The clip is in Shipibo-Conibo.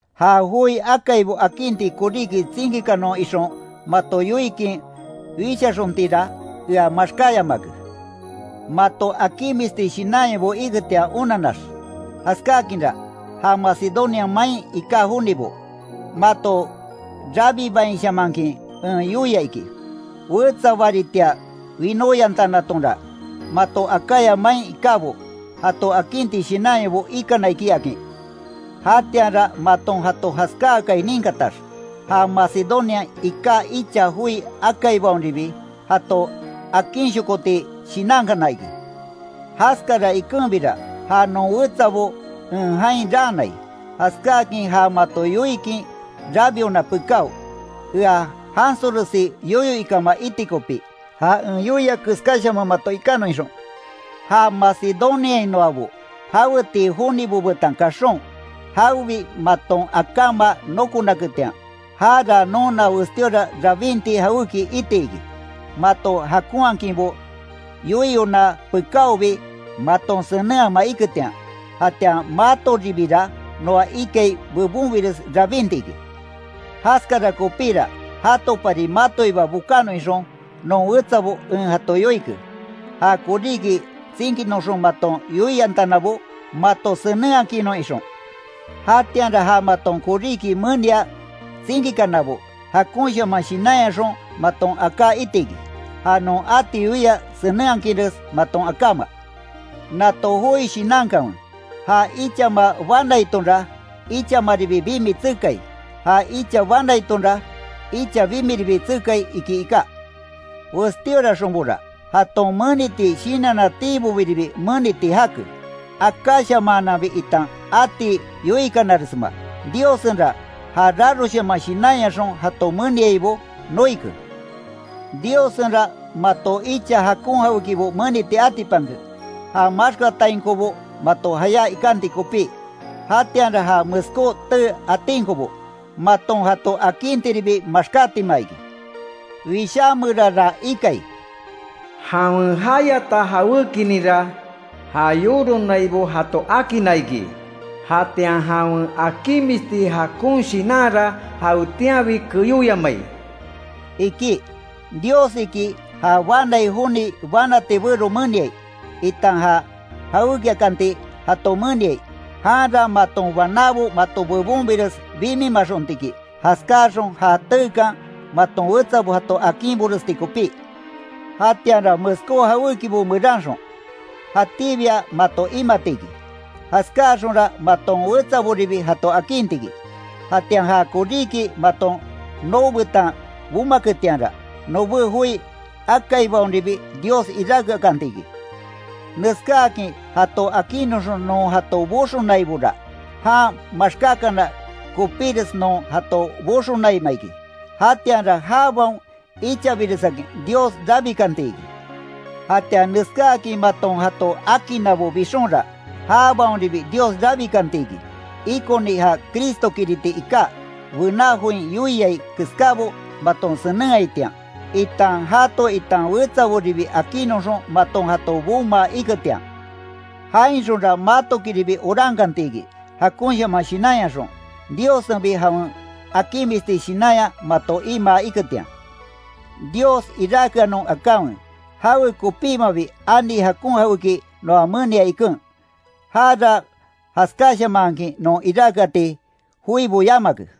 Ja joi akaibo akinti koríki tsinkikanon ixon mato yoikin wishaxontinra, ea maxkáyamake, mato akinmisti shinanyabo iketian onannax. Jaskakinra, ja Macedonia main iká jonibo, mato rabibainshamankin en yoia iki. Wetsa baritia winóyantanatonra, mato Acaya main ikábo, jato akinti shinanyabo ikana iki, akin. Jatianra maton jato jaskáakai ninkatax, ja Macedoniain iká icha joi akaibaonribi, jato akinshokoti shinankana iki. Jaskara ikenbira, ja non wetsabo en jain raanai, jaskáakin ja mato yoikin rabiona pekáo, ea jansoresi yoyo ikama iti kopi, ja en yoia keskáshaman mato ikanon ixon. Ja Macedoniainoabo jawetii jonibo betan kaxon, jawebi maton akáma nokonaketian, jara nona westíora rabinti jawéki iti iki, mato jakonhakinbo yoiyona pekáobi, maton senenhama iketian; jatian matoribira noa ikai bebonbires rabinti iki. Jaskara kopíra, jatopari matoiba bokanon ixon, non wetsabo en jato yoike, ja koríki tsinkinoxon maton yoiyantanabo mato senenhakinnnon ixon. Jatianra ja maton koríki menia tsinkikanabo, jakonshaman shinanyaxon maton aká iti iki, ja non ati yoia senenhakinres maton akáma. Nato joi shinankanwe: “Ja ichama banaitonra, ichamaribi bimi tsekai, ja icha banaitonra, icha bimiribi tsekai”, iki iká. Westíoraxonbora, jaton meniti shinannatiibobiribi meniti jake, akáshamaananbi itan ati yoikanaresma, Diossenra, ja raroshaman shinanyaxon jato meniaibo, noike. Diossenra mato icha jakon jawékibo meniti atipanke, ja maxkatainkobo mato jayá ikanti kopí. Jatianra ja meskó tee atinkobo, maton jato akintiribi maxkátima iki. Wishá meranra ikai: “Jawen jayata jawékininra ja yoronaibo jato akinna iki; jatian jawen akinmisti jakon shinanra jawetianbi keyóyamai”, iki. Dios iki ja banai joni banati bero meniai, itan ja jawékiakanti jato meniai, janra maton banábo mato bebonbires bimimaxonti iki, jaskáaxon ja teekan, maton wetsabo jato akinboresti kopí. Jatianra meskó jawékibo meranxon, jatíbia mato imati iki, jaskáaxonra maton wetsaboribi jato akinti iki. Jatian ja koríki maton noo betan bomaketianra, nobé joi akaibaonribi Dios iráke akanti iki. Neskáakin jato akinnoxon non jato boxonaibora, jan maxkákana kopíres non jato boxonaima iki, jatianra jabaon ichabiresakin Dios rabikanti iki. Jatian neskáakin maton jato akinnabo bixonra, jabaonribi Dios rabikanti iki, ikoni ja Cristokiriti iká, bená join yoiai keskábo maton senenhaitian, itan jato itan wetsaboribi akinnoxon maton jato bomaa iketian. Jainxonra matokiribi orankantiki, jakonshaman shinanyaxon, Diossenbi jawen akinmisti shinanya mato imaa iketian. ¡Dios iráke anon akanwe, jawe kopímabi ani jakon jaweki noa menia iken, jara jaskáshamanhakin non iráke ati joibo yamake!